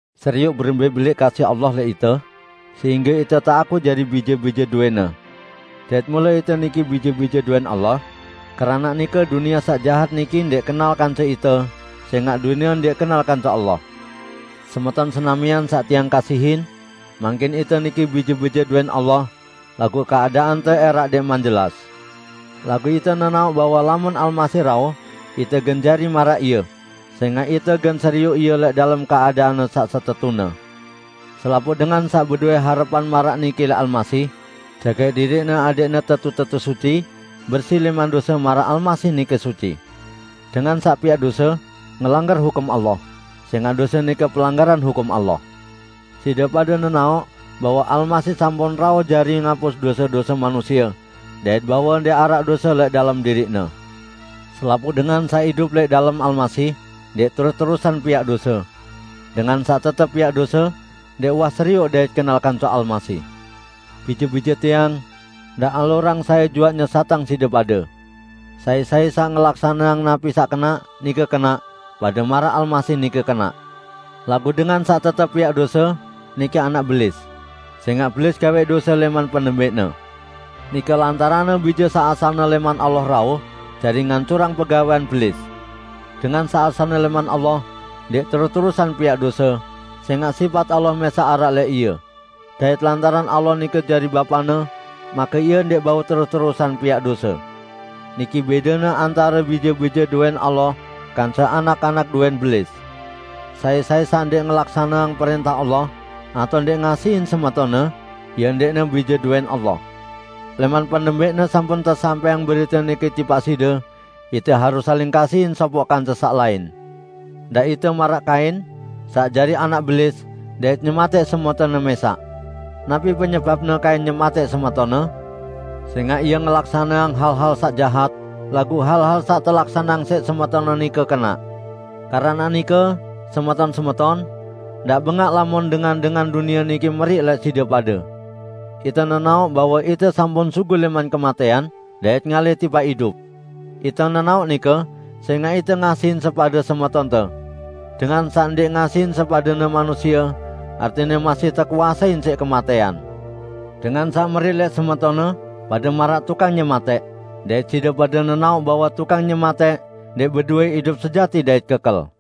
Serioq berembẽ belẽq kasih Allah lẽq ite, sehingge ite teakuq jari bije-bije dowẽ-Ne. Dait mule ite niki bije-bije dowẽn Allah. Keranaq nike dunie saq jahat niki ndẽq kenal kance ite, sẽngaq dunie ndẽq kenal kance Allah. Semeton senamian saq tiang kasihin! Mangkin ite niki bije-bije dowẽn Allah, laguq keadaante ẽraq ndẽqman jelas. Laguq ite nenaoq bahwe lamun Almasih rauh, ite gen jari maraq Ie, sẽngaq ite gen serioq Ie lẽq dalem keadaan-Ne saq setetune. Selapuq dengan saq bedowẽ harepan maraq niki lẽq Almasih, jagaq diriqne adẽqne tetu-tetu suci, bersi lẽman dose maraq Almasih nike suci. Dengan saq piaq dose, ngelanggar hukum Allah; sẽngaq dose nike pelanggaran hukum Allah. Side pade nenaoq bahwe Almasih sampun rauh jari ngapus dose-dose manusie, dait bahwe ndẽq araq dose lẽq dalem diriq-Ne. Selapuq dengan saq idup lẽq dalem Almasih, ndẽq terus-terusan piaq dose. Dengan saq tetep piaq dose, ndẽq uwah serioq dait kenal kance Almasih. Bije-bije tiang, ndaq alurang sai juaq nyesatang side pade. Sai-sai saq ngelaksaneang napi saq kenaq, nike kenaq, pade maraq Almasih nike kenaq. Laguq dengan saq tetep piaq dose, nike anak Belis, sẽngaq Belis gawẽq dose lẽman penembẽqne. Nike lantaranne Bije saq asalne lẽman Allah rauh, jari ngancurang pegawẽan Belis. Dengan saq asalne lẽman Allah, ndẽq terus-terusan piaq dose, sẽngaq sipat Allah mẽsaq araq lẽq ie. Dait lantaran Allah nike jari Bapane, make ie ndẽq bau terus-terusan piaq dose. Niki bẽdene antare bije-bije dowẽn Allah kance anak-anak dowẽn Belis: Sai-sai saq ndẽq ngelaksaneang prẽntah Allah, atao ndẽq ngasihin semetonne, ie ndẽqne bije dowẽn Allah. Lẽman penembẽqne sampun tesampẽang berite niki tipaq side: Ite harus saling kasihin sopoq kance saq lain. Ndaq ite maraq Kain, saq jari anak Belis dait nyematẽq semetonne mẽsaq. Napi penyebapne Kain nyematẽq semetonne? Sẽngaq ie ngelaksaneang hal-hal saq jahat, laguq hal-hal saq telaksaneang siq semetonne nike kenaq. Keranaq nike, semeton-semeton, ndaq bengaq lamun dengan-dengan dunie niki meriq lẽq side pade. Ite nenaoq bahwe ite sampun sugul lẽman kematẽan, dait ngalih tipaq idup. Ite nenaoq nike, sẽngaq ite ngasihin sepade semetonte. Dengan saq ndẽq ngasihin sepadene manusie, artine masih tekuasein siq kematẽan. Dengan saq meriq lẽq semetonne, pade maraq tukang nyematẽq, dait side pade nenaoq bahwe tukang nyematẽq ndẽq bedowẽ idup sejati dait kekel.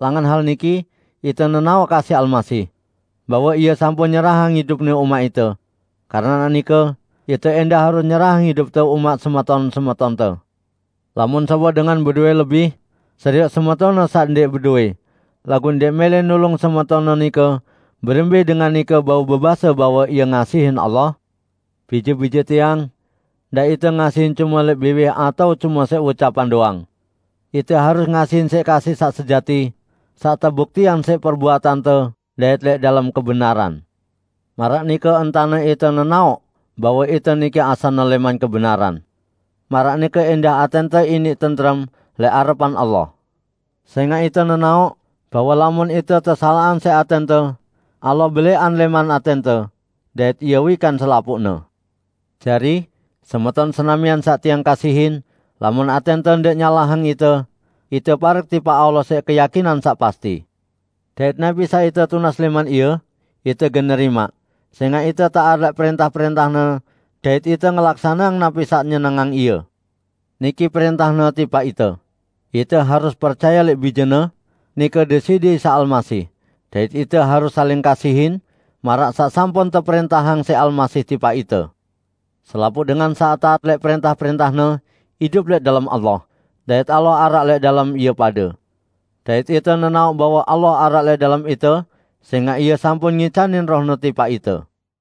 Langan hal niki ite nenaoq kasih Almasih. Bahwe Ie sampun nyerahang idup-Ne umaq ite. Keranaq nike, ite ẽndah harus nyerahang idupte umaq semeton-semetonte! Lamun sopoq dengan bedowẽ lebih, serioq semetonne saq ndẽq bedowẽ, laguq ndẽq mẽlẽ nulung semetonne nike, berembẽ dengan nike bau bebase bahwe ie ngasihin Allah? Bije-bije tiang! Ndaq ite ngasihin cume lẽq biwih atao cume siq ucapan doang. Ite harus ngasihin siq kasih saq sejati, saq tebuktiang siq perbuatante dait lẽq dalem kebenaran. Maraq nike entane ite nenaoq bahwe ite niki asalne lẽman kebenaran. Maraq nike ẽndah atẽnte iniq tentrem lẽq arepan Allah. Sẽngaq ite nenaoq, bahwe lamun ite tesalaqang siq atẽnte, Allah belẽqan lẽman atẽnte, dait Ie wikan selapuqne. Jari, semeton senamian saq tiang kasihin, lamun atẽnte ndẽq nyalahang ite, ite parek tipaq Allah siq keyakinan saq pasti. Dait napi saq ite tunas lẽman Ie, ite gen nerimaq, sẽngaq ite taat lẽq prẽntah-prẽntah-Ne dait ite ngelaksaneang napi saq nyenengang Ie. Niki prẽntah-Ne tipaq ite: Ite harus percaye lẽq Bije-Ne, nike Deside Isa Almasih, dait ite harus saling kasihin, maraq saq sampun teprẽntahang siq Almasih tipaq ite. Selapuq dengan saq taat lẽq prẽntah-prẽntah-Ne, idup lẽq dalem Allah, dait Allah araq lẽq dalem ie pade. Dait ite nenaoq bahwe Allah araq lẽq dalem ite, sẽngaq Ie sampun ngicanin Roh-Ne tipaq ite.